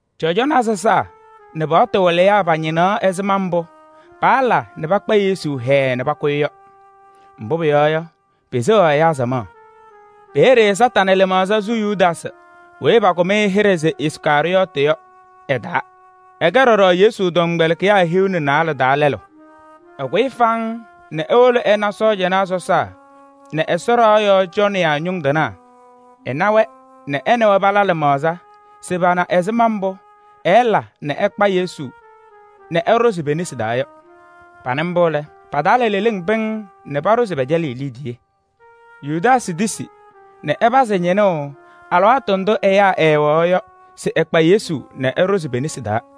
Cɔjɔnaa sɔsaa nɛ paɣtʋ wɩlɩyaa pañɩnɩ ɛzɩma mbʋ paala nɛ pakpa Yesu hɛɛɛ nɛ pakʋ-ɩ yɔ. Mbʋ pʋyɔɔ yɔ, peseɣaɣ ɛyaa samaɣ. Peeye Kañadʋ Satanɩ lɩmaɣza sʋ Yudaasɩ weyi pakʋm-ɩ hɩɖɛ se Iskarɩyɔɔtɩ yɔ ɛ-taa. Ɛkɛ ɖɔɖɔ Yesu tɔmkpɛlɩkɩyaa hiu nɛ naalɛ taa lɛlʋ. Ɛkʋyɩ faŋŋ nɛ ewolo ɛna cɔjɔnaa sɔsaa nɛ Ɛsɔ ɖɩɣa yɔɔ cɔnɩyaa ñʋŋ tɩnaa. Ɛna-wɛ nɛ ɛ nɛ wɛ pala lɩmaɣza se pana ɛzɩma mbʋ ɛɛla nɛ ɛkpa Yesu nɛ ɛɖʋzɩ pe-nesi taa yɔ. Panɩ mbʋ lɛ, pa-taa la leleŋ pɩŋŋ nɛ paɖʋ se pɛcɛlɩɣ-ɩ liidiye. Yudaasɩ tisi nɛ ɛpazɩ ñɩnʋʋ alɩwaatʋ ndʋ ɛyaa ɛɛwɛɣ yɔ se ɛkpa Yesu nɛ ɛɖʋzɩ pe-nesi taa.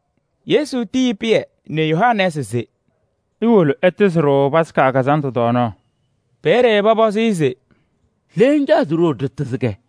Yesu tiyi Pɩyɛ nɛ Yohanɛɛsɩ se: “Iwolo ɩlabɩ-ɖʋ kazandʋ tɔɔnaɣ.” Peeye pɔpɔzɩ-ɩ se: “Le ŋcaɣ se ɖiwolo ɖɩlabɩ-kɛ?”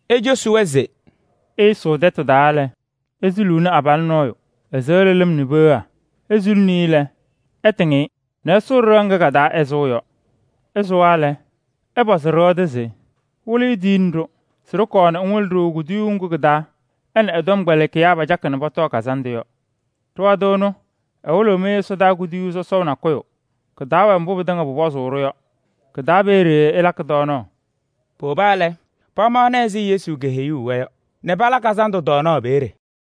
Ecosi-wɛ se: “Ɩsʋʋ tɛtʋ taa lɛ, isuluuni abalʋ nɔɔyʋ, ɛsɩɣlɩ lɩm nɛ peɣa. Isuluni-i lɛ, ɩtɩŋ-ɩ nɛ ɩsʋʋ ɖɩɣa ŋga ka-taa ɛsʋʋ yɔ. Ɩsʋwa lɛ, ɩpɔzɩ ɖɩɣa tʋ se: ‘Wɩlɩyʋ tiyini-ɖʋ se ɖɩkɔɔ ŋwɩlɩ-ɖʋ kuduyuu ŋgʋ kɩ-taa ɛ nɛ ɛ-tɔmkpɛlɩkɩyaa pacakɩ nɛ pɔtɔɔ kazandʋ yɔ.’ Ɖɩɣa tʋ ɛnʋ, ɛwɩlɩɣ-mɩ ɛsɔdaa kuduyuu sɔsɔʋ nakʋyʋ. Kɩ-taa wɛ mbʋ pɩtɩŋa pʋpɔzʋʋ-ɖʋ yɔ. Kɩ-taa peeye ɩlakɩ tɔɔnaɣ.” Powoba lɛ, pamaɣnɩ ɛzɩ Yesu keheyuu-wɛ yɔ nɛ pala kazandʋ tɔɔnaɣ peeye.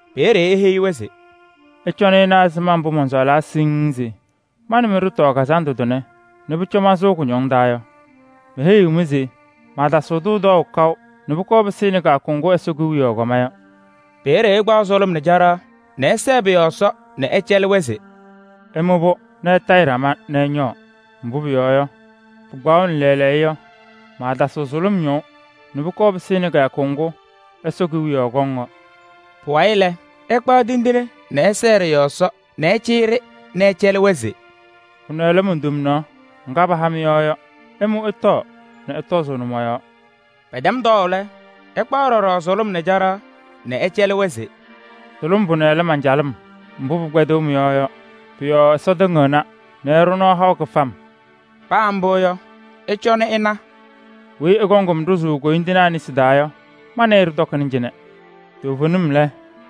Peeye eheyi-wɛ se: “Ɩcɔnɩ ɩna ɛzɩma mbʋ mɔnsɔɔlaa siŋŋ se ma nɛ mɩ ɖɩtɔɔ kazandʋ tʋnɛ nɛ pʋcɔ mansʋʋ kʋñɔŋ taa yɔ! Meheyiɣ-mɩ se maatasɩɣ-kʋ tɔɔʋ kaʋ nɛ pʋkɔɔ pɩsɩnɩ kɩyakʋ ŋgʋ Ɛsɔ Kewiyaɣ kɔma yɔ.” Peeye ɛkpaɣ sʋlʋm nɛ caɖaɣ nɛ ɛsɛɛ pʋ-yɔɔ Ɛsɔ nɛ ɛcɛlɩ-wɛ se: “Ɩmʋ-pʋ nɛ ɩtayɩ ɖama nɛ ɩñɔɔ.” Mbʋ pʋyɔɔ yɔ, pɩkpaɣʋnɩ lɛɛlɛɛyɔ yɔ, maatasɩɣ sʋlʋm ñɔʋ nɛ pʋkɔɔ pɩsɩnɩ kɩyakʋ ŋgʋ Ɛsɔ Kewiyaɣ kɔŋ yɔ. Pʋwayɩ lɛ, ɛkpaɣ tindine nɛ ɛsɛɛ ɖɩ-yɔɔ Ɛsɔ nɛ ɛcɩyɩ-ɖɩ nɛ ɛcɛlɩ-wɛ se: “Pʋnɛ lɛ mon-tomnaɣ [ŋga paha mɩ-yɔɔ yɔ. Ɩmʋ ɩtɔɔ nɛ ɩtɔzʋʋnɩ mɔ-yɔɔ.” Pɛtɛm tɔɔʋ lɛ, ɛkpaɣ ɖɔɖɔ sʋlʋm nɛ caɖaɣ nɛ ɛcɛlɩ-wɛ se: “Sʋlʋm pʋnɛ lɛ man-calɩm mbʋ pɩkpɛdɩɣ mɩ-yɔɔ yɔ. Pʋ-yɔɔ Ɛsɔ tɩŋɩɣna nɛ ɛɖʋ nɔɔ haʋ kɩfam.”] Paa mbʋ yɔ, ɩcɔnɩ ɩna: “Weyi ɛkɔŋ-m ɖʋzʋʋ koyindinaa nesi taa yɔ, ma nɛ ɩ ɖɩtɔkɩna cɩnɛ! Toovenim lɛ,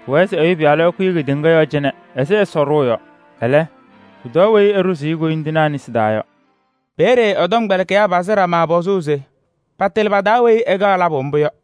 pʋwɛɛ se Ɛyʋ Pɩyalʋ ɛkʋyɩ kedeŋa yɔɔ cɩnɛ ɛzɩ Ɛsɔ ɖʋʋ yɔ. Ɛlɛ, pʋtɔɔ weyi ɛɖʋzʋʋ-ɩ koyindinaa nesi taa yɔ!” Peeye ɛ-tɔmkpɛlɩkɩyaa pazɩ ɖama pɔzʋʋ se patɩlɩ pa-taa weyi ɛkaɣ labʋ mbʋ yɔ.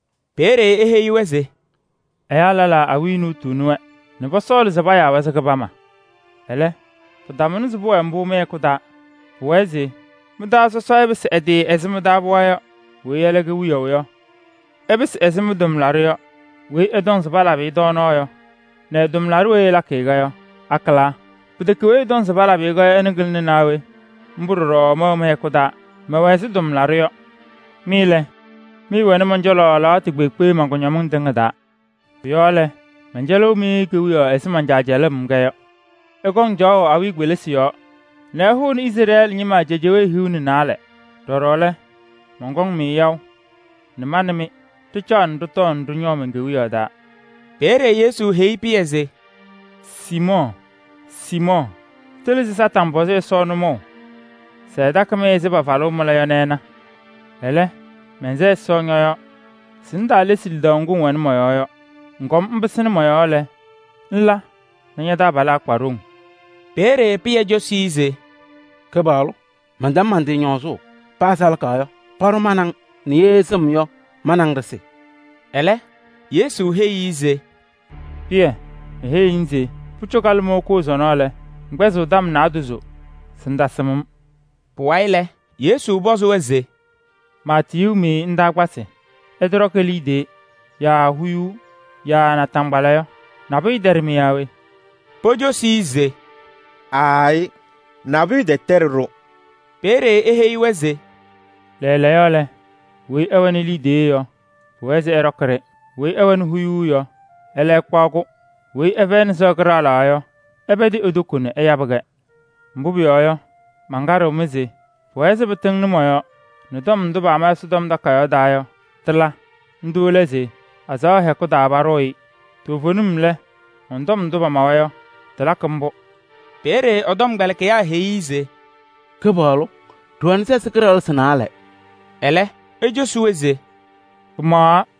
Peeye eheyi-wɛ se: “Ɛyaa lɛlaa awiya nuutuuni-wɛ nɛ pɔsɔɔlɩ se payaa-wɛ se kɩbama. Ɛlɛ, pɩtamʋnɩ se pʋwɛɛ mbʋ mɩ-hɛkʋ taa. Pʋwɛɛ se mɩ-taa sɔsɔ ɛpɩsɩ ɛ-tɩ ɛzɩ mɩ-taa pɩɣa yɔ. Weyi ɛlɛ kɛ wiyaʋ yɔ, ɛpɩsɩ ɛzɩ mɩ-tʋmlaɖʋ yɔ. Weyi ɛtɔŋ se palabɩ-ɩ tɔɔnaɣ yɔ nɛ ɛ-tʋmlaɖʋ weyi ɛlakɩ-kɛ yɔ, akɩlaa? Pɩtɛkɛ weyi ɛtɔŋ se palabɩ-ɩ-kɛ yɔ, ɛnʋ kɩlɩna naa we? Mbʋ ɖɔɖɔ mɛwɛ mɩ-hɛkʋ taa, mɛwɛ ɛzɩ tʋmlaɖʋ yɔ. Mɩ lɛ, mɩɩwɛnɩ mɔn-cɔlɔ alɩwaatʋ kpeekpe man-kʋñɔmɩŋ tɩŋa taa. Pʋ-yɔɔ lɛ, mɛncɛlɩɣ-mɩ kewiyaɣ ɛzɩ man-Caa cɛlʋʋ-m-kɛ yɔ. Ɩkɔŋ caɣʋ awiya kpelisi yɔɔ nɛ ɩhʋʋnɩ Izrɛɛlɩ ñɩma cejewee hiu nɛ naalɛ. Ɖɔɖɔ lɛ, mɔnkɔŋ-mɩ yaʋ nɛ ma nɛ mɩ ɖɩcaɣ nɛ ɖɩtɔɔ nɛ ɖɩñɔɔ men-Kewiyaɣ taa.” Peeye Yesu heyi Pɩyɛ se: “Siimɔɔ! Siimɔɔ! Tɩlɩ se Kañadʋ Satanɩ pɔzɩ Ɛsɔ nʋmɔʋ se ɛtakɩ-mɩ ɛzɩ pafalʋʋ mɩla yɔ nɛ ɛna. Ɛlɛ, mɛnsɛ Ɛsɔ ñɔ-yɔɔ se ŋtaalesi lidaʋ ŋgʋ ŋwɛnɩ mɔ-yɔɔ yɔ. Ŋkɔm ŋpɩsɩnɩ mɔ-yɔɔ lɛ, ŋla nɛ ña-taabalaa kpa ɖoŋ.” Peeye Pɩyɛ cosi-i se: “Kɩpaɣlʋ! Mɛntɛm man-tɩ ñɔɔzʋʋ. Paa salaka yɔ, paɖʋ ma nɛ ŋ nɛ ye sɩm yɔ, ma nɛ ŋ ɖɩsɩ.” Ɛlɛ Yesu heyi-i se: “Pɩyɛ! Meheyiɣ-ŋ se: pʋcɔ kalɩmɔʋ koo sɔnɔ lɛ, ŋkpɛzɩɣ tɔm naadozo se ŋtasɩm-m.” Pʋwayɩ lɛ, Yesu pɔzɩ-wɛ se: “Maatiyuu-mɩ ndaakpasɩ, ɩtɔɖɔkɩ liidiye yaa huyuu yaa naataŋgbala yɔ, nabʋyʋ tɛɖɩ-mɩ yaa we?” Pocosi-i se: “Aayɩ, nabʋyʋ tɛtɛɖɩ-ɖʋ.” Peeye eheyi-wɛ se: “Lɛɛlɛɛyɔ lɛ, weyi ɛwɛnɩ liidiye yɔ, pʋwɛɛ se ɛɖɔkɩ-ɖɩ. Weyi ɛwɛnɩ huyuu yɔ, ɛlɛ ɛkpaɣ-kʋ. Weyi ɛfɛyɩnɩ sɩɣa kɩɖaɣlaɣ yɔ, ɛpɛdɩ e-toko nɛ ɛyabɩ-kɛ. Mbʋ pʋyɔɔ yɔ, mankaɖɩɣ-mɩ se pʋwɛɛ se pɩtɩŋnɩ mɔ-yɔɔ nɛ tɔm ndʋ paama Ɛsɔtɔm Takayaɣ taa yɔ, tɩla. Ndʋ lɛ se: ‘Azaɣa hɛkʋ taa paɖʋʋ-ɩ.’ Toovenim lɛ, mɔn-tɔm ndʋ paamawa yɔ, tɩlakɩ mbʋ.” Peeye ɛ-tɔmkpɛlɩkɩyaa heyi-i se: “Kɩpaɣlʋ! Ɖɩwɛnɩ sɛsɩ kɩɖaɣlɩsɩ naalɛ.” Ɛlɛ ecosi-wɛ se: “Pɩmaɣaɣ.”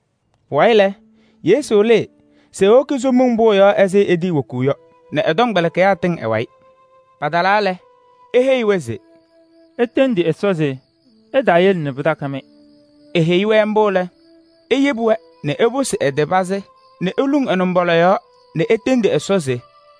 Pʋwayɩ lɛ, Yesu lɩɩ se ewoki Somiŋ Pʋʋ yɔɔ ɛzɩ etiiwokuu yɔ nɛ ɛ-tɔmkpɛlɩkɩyaa tɩŋ ɛ-wayɩ. Patalaa lɛ, eheyi-wɛ se: “Itendi Ɛsɔ se ɛtaayele nɛ pɩtakɩ-mɩ.” Eheyi-wɛ mbʋ lɛ, eyebi-wɛ nɛ eposi ɛ-tɩ pazɩ nɛ eluŋ ɛ-nɩmbɔla yɔɔ nɛ etendi Ɛsɔ se: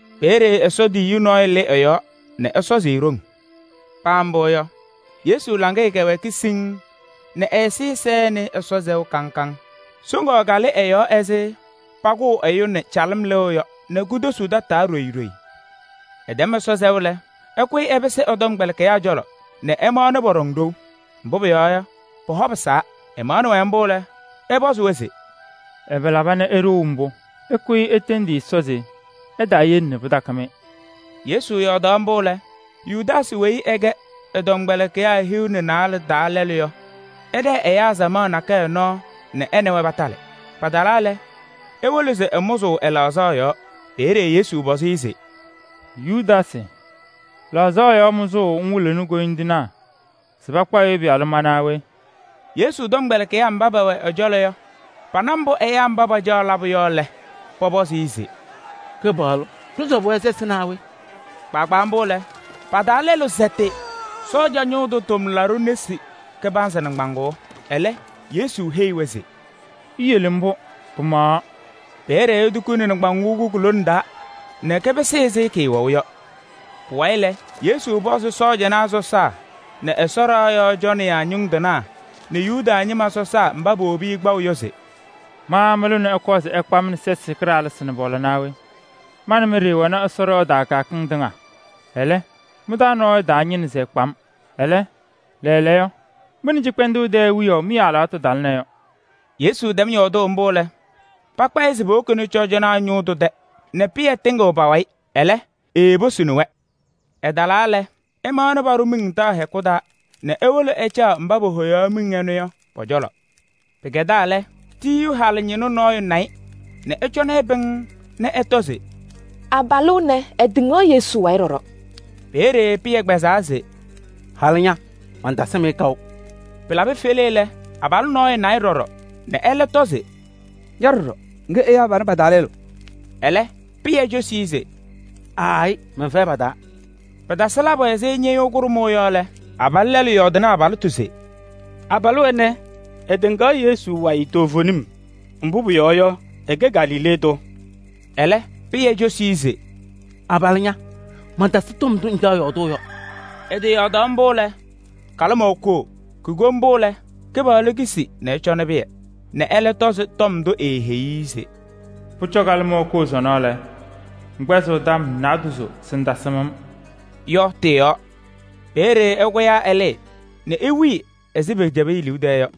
Peeye Ɛsɔ tiyiyu nɔɔyʋ lɩ ɛ-yɔɔ nɛ ɛsɔzɩ-ɩ ɖoŋ. Paa mbʋ yɔ, Yesu laŋɩyɛ kɛwɛɛkɩ sɔsɔm nɛ ɛ-ɛzɩyɛ sɛnɩ Ɛsɔ sɛʋ kaŋ kaŋ. Soŋaɣ kalɩ ɛ-yɔɔ ɛzɩ pʋkʋʋ ɛyʋ nɛ calɩm lɩɣ yɔ nɛ kotosuu tataa ɖoyi ɖoyi.] Ɛtɛm Ɛsɔ sɛʋ lɛ, ɛkʋyɩ ɛpɩsɩ ɛ-tɔmkpɛlɩkɩyaa cɔlɔ nɛ ɛmaɣnɩ pɔɖɔŋ ɖou, mbʋ pʋyɔɔ yɔ, pɔ-hɔ pɩsaa. Ɛmaɣnɩ-wɛ mbʋ lɛ, ɛpɔzɩ-wɛ se: “Ɛbɛ laba nɛ iɖou mbʋ? Ɩkʋyɩ itendi Ɛsɔ se ɛtaayele nɛ pɩtakɩ-mɩ.” Yesu yɔɔdaɣ mbʋ lɛ, Yudaasɩ weyi ɛkɛ ɛ-tɔmkpɛlɩkɩyaa hiu nɛ naalɛ taa lɛlʋ yɔ, ɛɖɛɛ ɛyaa samaɣ nakɛyɛ nɔɔ nɛ ɛ nɛ wɛ patalɩ. Patalaa lɛ, ewolo se ɛmʋzɩ ɛ-laɣzaɣ yɔɔ. Peeye Yesu pɔzɩ-ɩ se: “Yudaasɩ! Laɣzaɣ yɔɔ mʋzʋʋ ŋwɩlɩɣnɩ koyindinaa se pakpa Ɛyʋ Pɩyalʋ ma naa we?” Yesu tɔmkpɛlɩkɩyaa mba pɛwɛ ɛ-cɔlɔ yɔ, pana mbʋ pacaɣ labʋ yɔ lɛ, pɔpɔzɩ-ɩ se: “Kɩpaɣlʋ! Ɖɩsɔbɩ-wɛ sɛsɩ naa we?” Kpaagbaa mbʋ lɛ, pa-taa lɛlʋ sɛtɩ cɔjɔnaa ñʋʋ tʋ tʋmlaɖʋ nesi kɩbanzɩ nɩŋgbaŋʋʋ. Ɛlɛ Yesu heyi-wɛ se: “Iyele mbʋ, pɩmaɣaɣ.” Peeye etukuni nɩŋgbaŋʋʋ ŋgʋ ku-lone taa nɛ kɩpɩsɩ ɛzɩ kɩɩwɛʋ yɔ. Pʋwayɩ lɛ, Yesu pɔzɩ cɔjɔnaa sɔsaa nɛ Ɛsɔ ɖɩɣa yɔɔ cɔnɩyaa ñʋŋ tɩnaa nɛ Yuda ñɩma sɔsaa mba powobi-i kpaʋ yɔ se: “Ma mɩlʋ nɛ ɩkɔɔ se ɩkpaɣ-m nɛ sɛsɩ kɩɖaɣlɩsɩ nɛ pɔla naa we? Ma nɛ mɩ ɖɩɩwɛ Ɛsɔ ɖɩɣa taa kɩyakɩŋ tɩŋa, ɛlɛ mɩ-taa nɔɔyʋ taañɩnɩ se ɛkpa-m. Ɛlɛ, lɛɛlɛɛyɔ, mɩ nɛ cɩkpɛndʋʋ tɛɛ wiyaʋ mɩ-alɩwaatʋ talɩna yɔ.” Yesu tɛm yɔɔdʋʋ mbʋ lɛ, pakpa-ɩ se powokini-i cɔjɔnaa ñʋʋ tʋ tɛ nɛ Pɩyɛ tɩŋɩɣ pa-wayɩ, ɛlɛ, eeposini-wɛ. Ɛtalaa lɛ, ɛmaɣnɩ paɖʋ miŋ taɣ hɛkʋ taa nɛ ewolo ɛcaɣ mba pohoyaɣ-ɩ yɔ pɔ-cɔlɔ. Pɩkɛdaa lɛ, tiyiyu halʋ ñɩnʋ nɔɔyʋ na-ɩ nɛ ɛcɔnɩ-ɩ pɩŋŋ nɛ ɛtɔ se: “Abalʋ ɛnɛ, ɛtɩŋaɣ Yesu wayɩ ɖɔɖɔ!” Peeye Pɩyɛ kpɛzaa se: “Halʋ ña! Mantasɩm-ɩ kaʋ.” Pɩlabɩ fele lɛ, abalʋ nɔɔyʋ na-ɩ ɖɔɖɔ nɛ ɛlɛ tɔ se: “Ña ɖɔɖɔ, ŋkɛ ɛyaa panɛ pa-taa lɛlʋ.” Ɛlɛ, Pɩyɛ cosi-i se: “Aayɩ! Mɛnfɛyɩ pa-taa.” Pɩtasɩ labʋ ɛzɩ ñɩɣyʋʋ kʋɖʋmʋʋ yɔ lɛ, abalʋ lɛlʋ yɔɔdɩnɩ abalɩtʋ se: “Abalʋ ɛnɛ, ɛtɩŋaɣ Yesu wayɩ toovenim, mbʋ pʋyɔɔ yɔ, ɛkɛ Galilee tʋ.” Ɛlɛ Pɩyɛ cosi-i se: “Abalʋ ña! Mantasɩ tɔm ndʋ ŋcaɣ yɔɔdʋʋ yɔ. Ɛtɩyɔɔdaɣ mbʋ lɛ, kalɩmɔʋ koo.” Kuko mbʋ lɛ, Kɩpaɣlʋ kisi nɛ ɛcɔnɩ Pɩyɛ nɛ ɛlɛ tɔzɩ tɔm ndʋ eeheyi-i se: “Pʋcɔ kalɩmɔʋ koo sɔnɔ lɛ, ŋkpɛzɩɣ tɔm naadozo se ŋtasɩm-m” yɔ tɩ-yɔɔ. Peeye ɛkʋyaa ɛlɩɩ nɛ ewili ɛzɩ pɛcɛbɩ e-liu tɛɛ yɔ.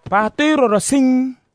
Paatʋ-ɩ ɖɔɖɔ siŋŋ.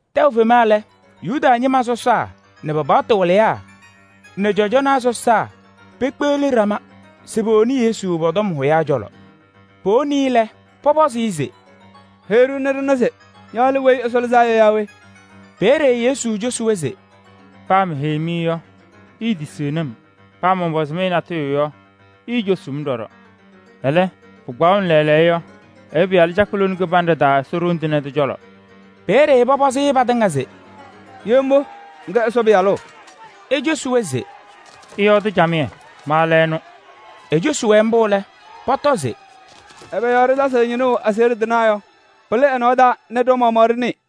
Tɛʋ fema lɛ, Yuda ñɩma sɔsaa nɛ pa-paɣtʋ wɩlɩyaa nɛ cɔjɔnaa sɔsaa pekpeɣli ɖama se powoni Yesu pɔ-tɔm hʋyaa cɔlɔ. Powoni-i lɛ, pɔpɔzɩ-ɩ se: “Heyi-ɖʋ nɛ ɖɩna se ña lɛ Weyi Ɛsɔ Lɩzaa Yɔ yaa we?” Peeye Yesu cosi-wɛ se: “Paa meheyi-mɩ yɔ, iitisiɣni-m. Paa mɔnpɔzɩ-mɩ natʋyʋ yɔ, iicosuu-m ɖɔɖɔ. Ɛlɛ, pɩkpaɣʋnɩ lɛɛlɛɛyɔ yɔ, Ɛyʋ Pɩyalʋ cakɩ lone kɩbanɖɛ taa Ɛsɔ Ɖoŋ Tɩŋa Tʋ cɔlɔ.” Peeye pɔpɔzɩ-ɩ patɩŋa se: “Ye mbʋ, ŋkɛ Ɛsɔ Pɩyalʋ?” Ecosi-wɛ se: “Ɩyɔɔdɩ camɩyɛ, ma lɛ ɛnʋ.” Ecosi-wɛ mbʋ lɛ, pɔtɔ se: “Ɛbɛ yɔɔ ɖɩtasɩɣ ñɩnʋʋ aseɣɖe tɩnaa yɔ? Pɩlɩ ɛ-nɔɔ taa nɛ ɖa-maɣmaɣ ɖɩnɩɩ.”